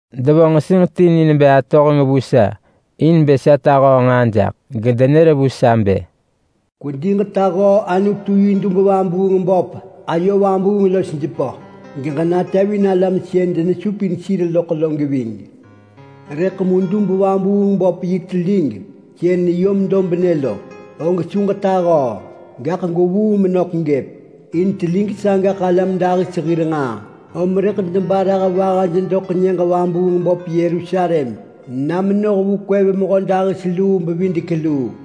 Devo nġesinġ ti ni nebë atohenġ vu sa in bë sa tahöö nġaa jaḳ, gedenër vu sa bë, “Kwedi ġetahöö Anutu yi dub-vabuung-böp ayo vabuung los jepö, geġenatevin alam sën denesupin sir loḳ lo geving. Rëḳ mu dub-vabuung-böp yi telig sën neyom dobnë lo, og su ġetahöö, gaḳ gwevuu menök gëp. In telig sagaḳ alam dahis hir nġaa, om rëḳ debarah vahaj doḳ nyëġ vabuung böp Yerusalem na menoh vu kwev mehödahis-luu-bevidek-luu.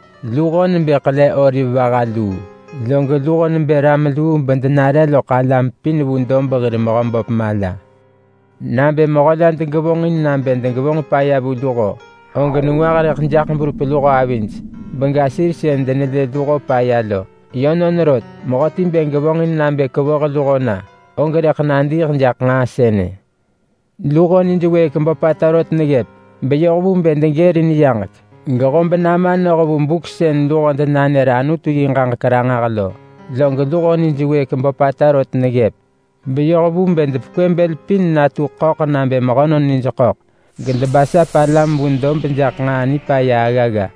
Luho nebë ḳele oliv vaha luu. Log luho nebë ram luu bedenare loḳ alam pin vu dob hir Mehöböp mala. Nabë mehö la degevonġin nabë degevonġ paya vu luho, og nengwah rëḳ jaḳ berup luho avij bega sir sën denelë luho paya lo. Yönon rot, mehöti bë gevonġin nabë kevoh luho na, og rëḳ nadiiḳ jaḳ nġaa sënë. Luho nij wëëk böpata rot neggëp beyoh vu bë degërin yaġek gehob nama noh vu buk sën luho denanër Anutu yi ġaġek ranġah lo. Log luho nij wëëk böpata rot neggëp beyoh vu bë depekwë bël pin natu ḳöḳ nabë mehönon nij ḳöḳ, gedebasap alam vu dob jaḳ nġaa nipaya aggagga.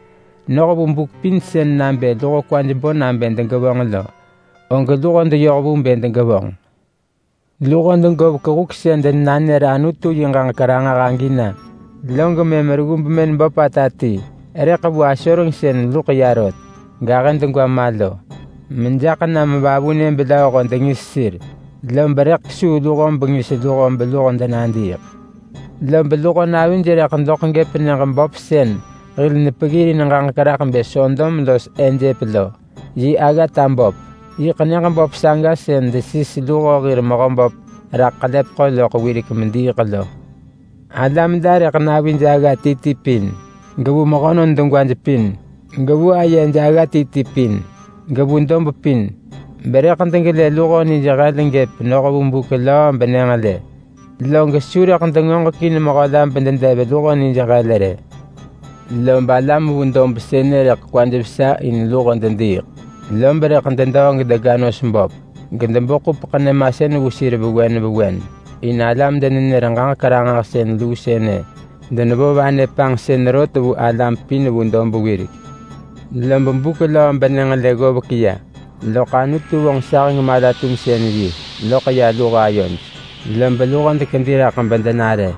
Noh vu buk pin sën nabë luho kwaj bo nabë degevonġ lo, og luho deyoh vu bë degevonġ. Luho degovek huk sën denanër Anutu yi ġaġek ranġah agi na, log mëm reggu bemën böpata ti rëḳ vu asoreng sën luḳ ya rot gahë degwa ma lo, mejaḳ nam vavunë belööho dengis sir. Lob rëḳ kesuu luho bengis luho beluho denadiiḳ. Lob luho navij rëḳ doḳ gëp nyëġ böp sën hil nepeggirin ġaġek raḳ bë Sodom los Ejep lo yi aggata böp. Yiḳ nyëġ böp saga sën desis luho hir Mehöböp raḳ ḳelepeḳo loḳ wirek mediiḳ lo. Alam la rëḳ vu navij agga ti ti pin, gevu mehönon degwaj pin, gevu ayej agga ti ti pin, gevu dob pin, berëḳ degelë luho nij hel gëp noh vu buk löö benyënġelë. Log su rëḳ dengoġekin mehö la bededev luho nij hel rë. Lob alam vu dob sënë rëḳ kwaj vesa in luho dediiḳ, lob rëḳ dedöö gedega nos böp, gedebo ḳupeḳ nyëmasën vu sir vewen vewen. In alam-denenër-ġaġek-ranġahsën luu sënë denevo vanë panġsën rot vu alam pin vu dob wirek. Lob buk löö benyënġelë ggovek ya, loḳ Anutu vonġ saheng mala-tumsën-yi loḳ ya luho ayoj. Lob luho dekedi raḳ bedenare.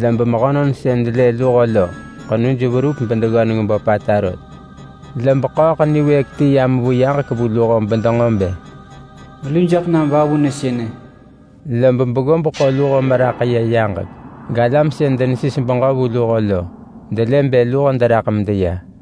Lob mehönon sën delë luho lo ḳenuj verup bedeggöneng böpata rot. Lob ḳööḳ niwëëk ti yam vu yaġek vu luho bedenġo bë, “Melu jaḳ nam vavunë sënë.” Lob beggob ḳo luho meraḳ ya yaġek galam sën denesis beġö vu luho lo, delë bë luho deraḳ medeya.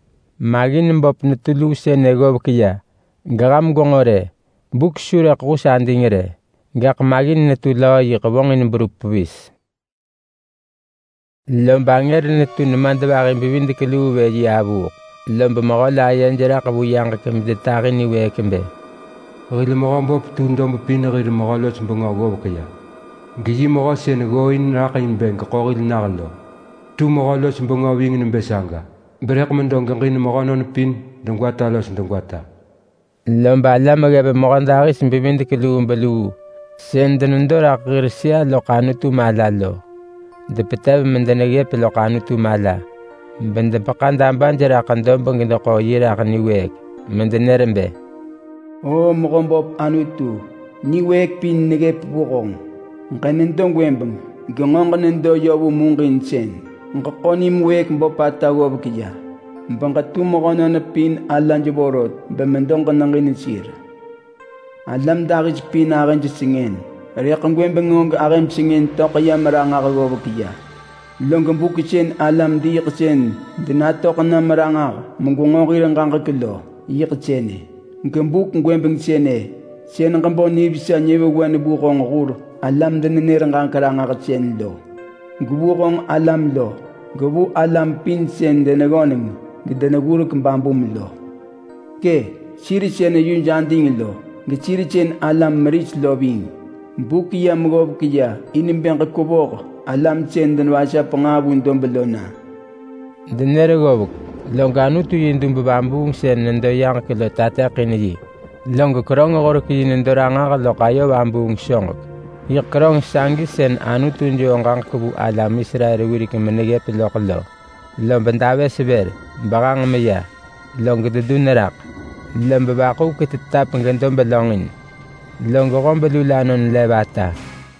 Maggin böp netu luu sënë ggovek ya. Geham gwenġo rë! Buk su rëḳ hus ading rë, gaḳ maggin netu löö yiḳ vonġin berup pevis. Log angër netu nemadvahi-bevidek-luu vë yi avuuḳ, lob mehö la ayej raḳ vu yaġek medetahi niwëëk bë: “Hil Mehöböp tu dob pin hir Mehö-los-bengö ggovek ya, geyi mehö sën ggooin raḳ in bë geḳo hil nah lo tu Mehö-los-bengö ving nebë saga, berëḳ medo geġin mehönon pin degwata los degwata!” Lob alam ggev mehödahis-bevidek-lubeluu sën denedo raḳ hir sëa loḳ Anutu mala lo depetev medeneggëp loḳ Anutu mala bedepeḳa dabaj raḳ dob gedeḳo yi raḳ niwëëk, medenër bë: “Oo Mehöböp Anutu, niwëëk pin neggëp vu honġ. Ġenedo gwëbeng, genġo ġenedo yö vu muġinsën. Ġeḳo nim wëëk böpata ggovek ya, beġetu mehönon pin alaj vorot bemedo ġeneġin sir. Alam dahis pin ahëj sengën, rëḳ gwëbeng, og ahëm sengën töḳ yam ranġah ggovek ya. Log buk sën alam-diiḳsën denatöḳ nam ranġah megwenġo hir ġaġek lo yiḳ sënë. Gebuk gwëbeng sënë, sën ġebo nivesa nyëvewen vu honġ hur alam-denenër-ġaġek-ranġahsën lo, gevu honġ alam lo, gevu alam pin sën deneggöneng gedeneggurek babum lo. Kë! Sir sën yuj ading lo, gesir sën alam meris lo ving. Buk yam ggovek ya in bë ġekwevoh alam sën denevasap nġaa vu dob lo na!” Denër ggovek, log Anutu yi dub vabuung sën nedo yaġek lo tateḳin yi, log keröng-horek-yi nedo ranġah loḳ ayo vabuung soġek. Yiḳ keröng sagi sën Anutu joo ġaġek vu alam Israel wirek meneggëp loḳ lo. Lob davës vër behang meya, log dedun raḳ, lob vaḳuvek tetap gedob lönġin, log hob lulanon lev ata.